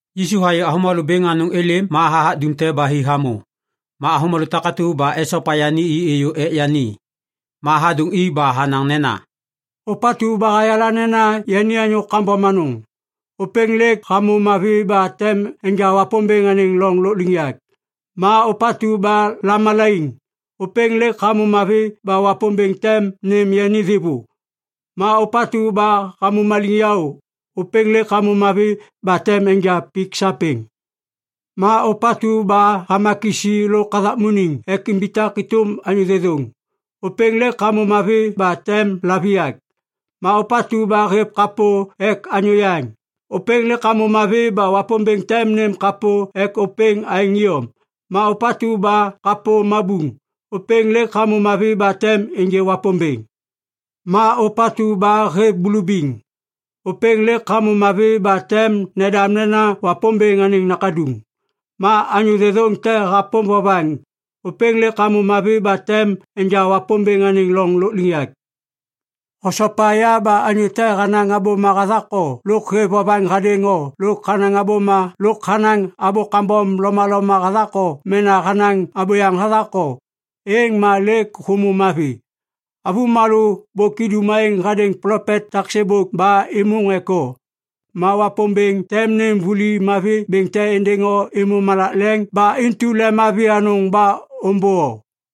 Yisu hayê avômalô bêŋ anôŋ êlêm ma hathak dumte ba hi hamô. Ma avômalô takatu ba esopa yani i êyô ek yani. Ma hadôŋ i ba hanaŋ nena, “Ôpatu ba hayala nena yani anyô kambom anôŋ, ôpêŋ lêk hamô mavi ba tem enja Wapômbêŋ anêŋ loŋ lôkliŋyak. Ma ôpatu ba lamalaiŋ, ôpêŋ lêk hamô mavi ba Wapômbêŋ tem nêm yani thêvô. Ma ôpatu ba hamô maliŋyaô, ôpêŋ lêk hamô mavi ba tem enja pik sapêŋ. Ma ôpatu ba hama kisi lôk hathakmuniŋ ek imbitak êtôm anyô thêthôŋ, ôpêŋ lêk hamô mavi ba tem laviyak. Ma ôpatu ba hêv kapô ek anyô yaŋ, ôpêŋ lêk hamô mavi ba Wapômbêŋ tem nêm kapô ek ôpêŋ aêŋ iyom. Ma ôpatu ba kapô mabuŋ, ôpêŋ lêk hamô mavi ba tem ênjê Wapômbêŋ. Ma ôpatu ba hêv bulubiŋ, ôpêŋ lêk hamô mavi ba tem nendam nena Wapômbêŋ anêŋ nakaduŋ. Ma anyô thêthôŋ te hapôm vovaŋ, ôpêŋ lêk hamô mavi ba tem enja Wapômbêŋ anêŋ loŋ lôkliŋyak. “Hosopa ya ba anyô te hanaŋ abôma hathak o lôk hêv vovaŋ hadêŋ o lôk hanaŋ abô kambom lomaloma hathak o mena hanaŋ abôyaŋ hathak o, êŋ ma lêk hômô mavi! “Avômalô bôk idum aêŋ hadêŋ plopet tak sêbôk ba êmôŋ ek o. Ma Wapômbêŋ tem nêm vuli mavi bêŋ te êndêŋ o êmô malak leŋ ba intu lemmavi anôŋ ba ômbô o!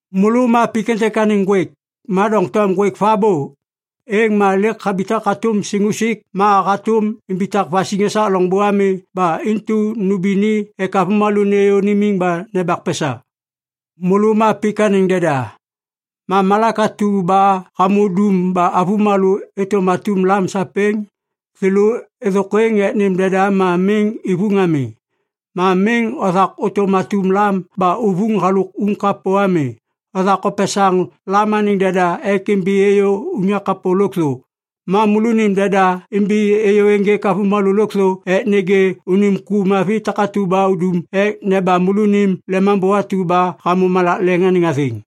“Môlô ma pik êntêk anêŋ ŋgwêk. Ma doŋtom ŋgwêk vabô, êŋ ma lêk habitak hatôm siŋusik ma hatôm imbitak vasiŋ esak loŋbô ami ba intu nômbi ni ek avômalô nêyô nimiŋ ba nembak pesa. “Môlô ma pik anêŋ deda. Ma malak atu ba hamô dum ba avômalô êtôm atum lam sapêŋ, thêlô êthôkwêŋ ek nêm deda ma miŋ ivuŋ ami. Ma miŋ othak ôtôm atum lam ba uvuŋ halôk uŋ kapô ami. Othak opesaŋ lam anêŋ deda ek imbi êyô unyak kapô lôkthô. “Ma môlônim deda imbi êyô ênjêk avômalô lôkthô ek nêgê unim ku mavi takatu ba udum ek nebam môlônim lemambô atu ba hamô malak leŋ anêŋ athêŋ.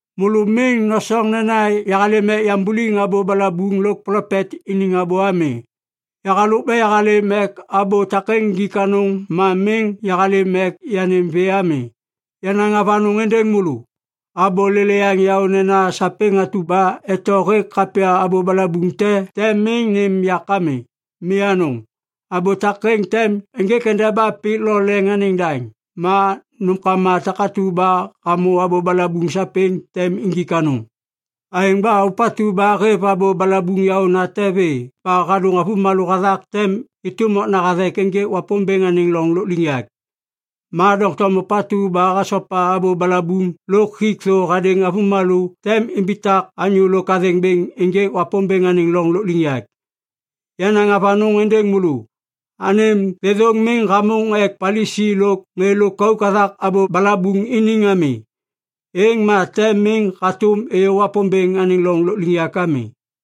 “Môlô miŋ nosoŋ nena yahalêm ek yambuliŋ abô balabuŋ lôk plopet iniŋ abô ami. Yahalôk ba yahalêm ek abô takêŋ injik anôŋ ma miŋ yahalêm ek yanêm vê ami. Yanaŋ avanôŋ êndêŋ môlô. Abô lêlêyaŋ yaô nena sapêŋ atu ba eto hêk kapya abô balabuŋ te tem miŋ nêm yak ami. Mi anôŋ. Abô takêŋ tem ênjêk endeba pik lo leŋ anêŋ daŋ. Ma nômkama takatu ba hamô abô balabuŋ sapêŋ tem injik anôŋ. Aêŋ ba ôpatu ba hêv abô balabuŋ yaônate vê ba hadôŋ avômalô hathak tem êtôm okna hathek ênjêk Wapômbêŋ anêŋ loŋ lôkliŋyak. Ma doŋtom ôpatu ba hasopa abô balabuŋ lôk hik thô hadêŋ avômalô tem imbitak anyô lôk athêŋ bêŋ ênjêk Wapômbêŋ anêŋ loŋ lôkliŋyak. Yanaŋ avanôŋ êndêŋ môlô. Anêm thêthôŋ miŋ hamôŋ ek Palisi lôk ŋê lôkauk hathak abô balabuŋ iniŋ ami, êŋ ma tem miŋ hatôm ôyô Wapômbêŋ anêŋ loŋ lôkliŋyak ami.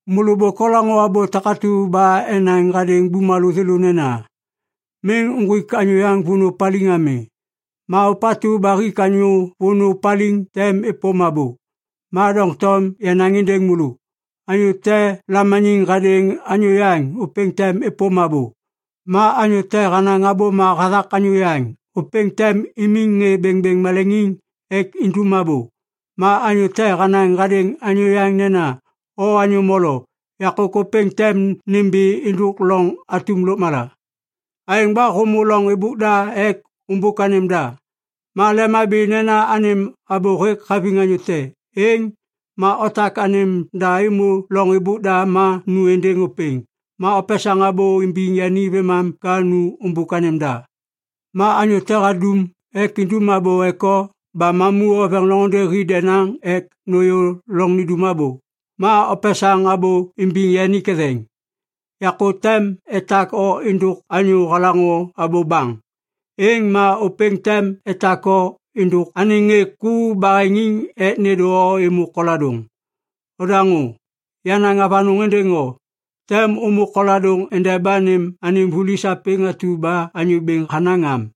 “Môlô bôk olaŋô abô takatu ba enaŋ hadêŋ bumalô thêlô nena, ‘Miŋ uŋgwik anyô vônô paliŋ ami. Ma ôpatu ba hik anyô vônô paliŋ tem êpôm abô.’ Ma doŋtom yanaŋ êndêŋ môlô. Anyô te lamaniŋ hadêŋ anyô yaŋ, ôpêŋ tem êpôm abô. Ma anyô te hanaŋ abôma hathak anyô yaŋ, ôpêŋ tem imiŋ ŋê bêŋbêŋ maleŋiŋ ek indum abô. Ma anyô te hanaŋ hadêŋ anyô yaŋ nena, ‘O anyô molo’, yakô ôpêŋ tem nimbi êndôk loŋ atum lôkmala. “Aêŋ ba hômô loŋ êbôk da ek ômbôk anêm da, ma lemhabi nena anêm abô hêk haviŋ anyô te, êŋ ma otak anêm da êmô loŋ êbôk da ma nu êndêŋ ôpêŋ. Ma opesaŋ abô imbiŋ yani vêmam ka nu ômbôk anêm da. “Ma anyô te hadum ek idum abô ek o ba mamu oveŋ loŋôndê hi denaŋ ek nôyô loŋ nindum abô, ma opesaŋ abô imbiŋ yani ketheŋ. Yakô tem etak o êndôk anyô halaŋô abô baŋ. Êŋ ma ôpêŋ tem etak o êndôk anêŋ ŋê ku baheŋiŋ ek nêndô o êmô koladôŋ. Odaŋô! Yanaŋ avanôŋ êndêŋ o. Tem ômô koladôŋ endeba nêm anêm vuli sapêŋ atu ba anyô bêŋ hanaŋ am.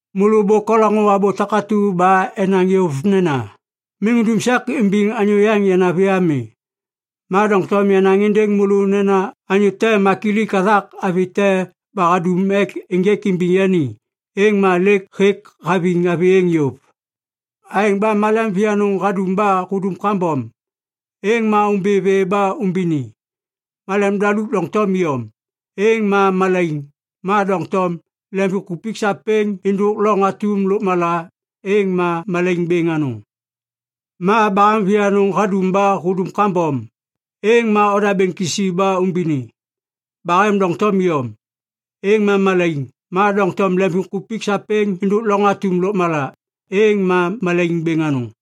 “Môlô bôk olaŋô abô takatu ba enaŋ yôv nena, ‘Miŋ undum sek imbiŋ anyô yaŋ yanavi ami.’ Ma doŋtom yanaŋ êndêŋ môlô nena anyô te makilik hathak avi te ba hadum ek ênjêk imbiŋ yani, êŋ ma lêk hêk haviŋ avi êŋ yôv. Aêŋ ba malem vianôŋ hadum ba hudum kambom, êŋ ma ômbi vê ba umbini! Malem daluk doŋtom iyom, êŋ ma malaiŋ. Ma doŋtom, lemvimkupik sapêŋ êndôk loŋ atum lôkmala, êŋ ma malaiŋ bêŋ anôŋ. Ma bahem vianôŋ hadum ba hudum kambom, êŋ ma odabêŋ kisi ba umbini! Bahem doŋtom iyom, êŋ ma malaiŋ. Ma doŋtom lemvimkupik sapêŋ êndôk loŋ atum lôkmala, êŋ ma malaiŋ bêŋ anôŋ.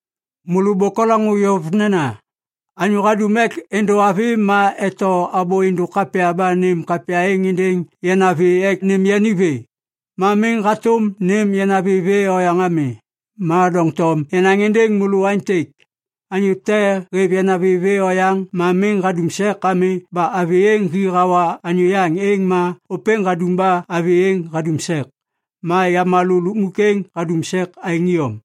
“Môlô bôk olaŋô yôv nena, ‘Anyô hadum ek êndô avi ma eto abô êndôk kapya ba nêm kapya êŋ êndêŋ yanavi ek nêm yani vê. Ma miŋ hatôm nêm yanavi vê oyaŋ ami.’ Ma doŋtom yanaŋ êndêŋ môlô aêntêk. Anyô te hêv yanavi vê oyaŋ ma miŋ hadum sek ami ba avi êŋ hi hawa anyô yaŋ êŋ ma ôpêŋ hadum ba avi êŋ hadum sek. Ma yamalô lukmuk êŋ hadum sek aêŋ iyom.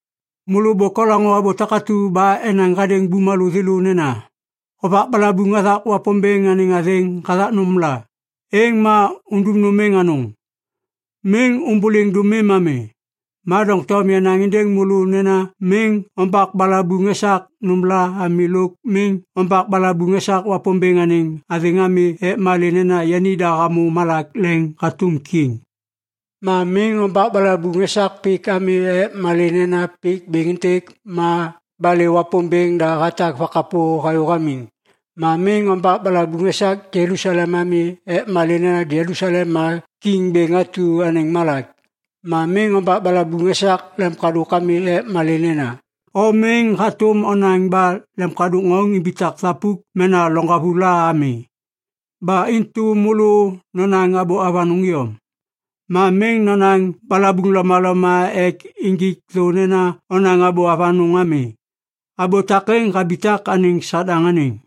“Môlô bôk olaŋô abô takatu ba enaŋ hadêŋ bumalô thêlô nena, ‘Hovak balabuŋ hathak Wapômbêŋ anêŋ athêŋ hathak nômla, êŋ ma undum nôm êŋ anôŋ.’ Miŋ ômbôliŋ dômim ami. Ma doŋtom yanaŋ êndêŋ môlô nena miŋ ombak balabuŋ esak nômla ami lôk miŋ ombak balabuŋ esak Wapômbêŋ anêŋ athêŋ ami ek malê nena yanida hamô malak leŋ hatôm kiŋ. Ma miŋ ombak balabuŋ esak pik ami ek malê nena pik bêŋ êntêk ma balê Wapômbêŋ da hatak vakapô hayô hamiŋ. Ma miŋ ombak balabuŋ esak Jelusalem ami ek malê nena Jelusalem ma Kiŋ Bêŋ atu anêŋ malak. Ma miŋ ombak balabuŋ esak lemkadôk ami ek malê nena o miŋ hatôm onaŋ ba lemkadôk ŋauŋ imbitak thapuk mena loŋgavu la ami. Ba intu môlô nonaŋ abô avanôŋ iyom. Ma miŋ nonaŋ balabuŋ lomaloma ek injik thô nena onaŋ abô avanôŋ ami. Abô takêŋ habitak anêŋ Sadaŋ anêŋ.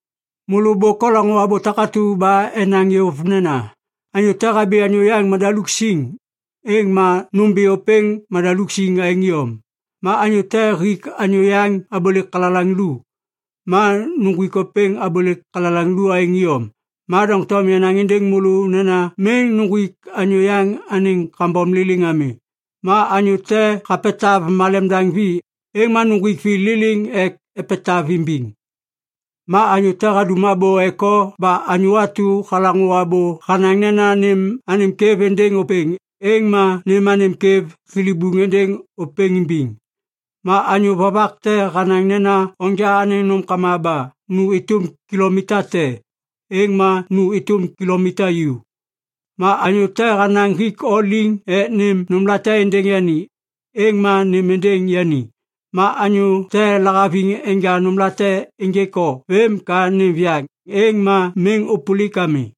“Môlô bôk olaŋô abô takatu ba enaŋ yôv nena, ‘Anyô te habi anyô yaŋ madaluk siŋ, êŋ ma nômbi ôpêŋ madaluk siŋ aêŋ iyom. Ma anyô te hik anyô yaŋ abôlêk kalalaŋ lu, ma uŋgwik ôpêŋ abôlêk kalalaŋ lu aêŋ iyom.’ Ma doŋtom yanaŋ êndêŋ môlô nena miŋ uŋgwik anyô yaŋ anêŋ kambom liliŋ ami. Ma anyô te hapetav malem daŋ vi, êŋ ma nuŋgwik vi liliŋ ek epetav imbiŋ. Ma anyô te hadum abô ek o ba anyô atu halaŋô abô hanaŋ nena nêm anêm kwêv êndêŋ ôpêŋ, êŋ ma nêm anêm kwêv thilibuŋ êndêŋ ôpêŋ imbiŋ. Ma anyô vovak te hanaŋ nena onja anêŋ nômkama ba nu êtôm kilomita te, êŋ ma nu êtôm kilomita ju. Ma anyô te hanaŋ hik o liŋ ek nêm nômlate êndêŋ yani, êŋ ma nêm êndêŋ yani. Ma anyô te lahaviŋ enja nômlate ênjêk o vêm ka nêm viyaŋ, êŋ ma miŋ ôpôlik ami.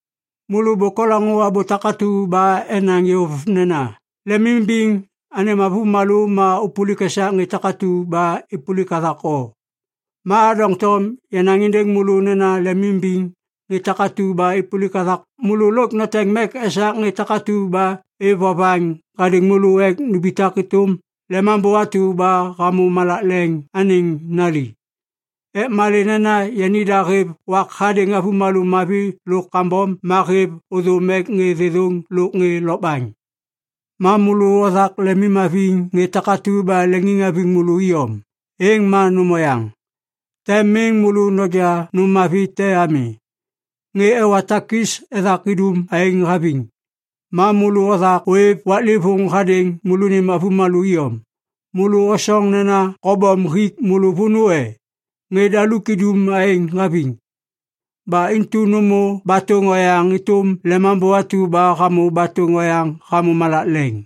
“Môlô bôk olaŋô abô takatu ba enaŋ yôv nena, ‘Lemimbiŋ anêm avômalô ma ôpôlik esak ŋê takatu ba êpôlik hathak o.’ Ma doŋtom yanaŋ êndêŋ môlô nena lemimimbiŋ ŋê takatu ba êpôlik hathak môlô lôk noteŋ mek esak ŋê takatu ba êv vovaŋ hadêŋ môlô ek numbitak êtôm Lemambô atu ba hamô malak leŋ anêŋ nali. Ek malê nena yanida hêv wak hadêŋ avômalô mavi lôk kambom ma hêv ôthôm ek ŋê thêthôŋ lôk ŋê lokbaŋ. Ma môlô othak lemimhaviŋ ŋê takatu ba leŋiŋhaviŋ môlô iyom, êŋ ma nôm oyaŋ. Tem miŋ môlô noja nôm mavi te ami. Ŋê ewa takis ethak idum aêŋ haviŋ! Ma môlô othak ôêv waklêvôŋ hadêŋ môlônim avômalô iyom, môlô osoŋ nena kobom hik môlô vônô e? Ŋê daluk idum aêŋ haviŋ! Ba intu nômô batôŋ oyaŋ êtôm Lemambô atu ba hamô batôŋ oyaŋ hamô malak leŋ.”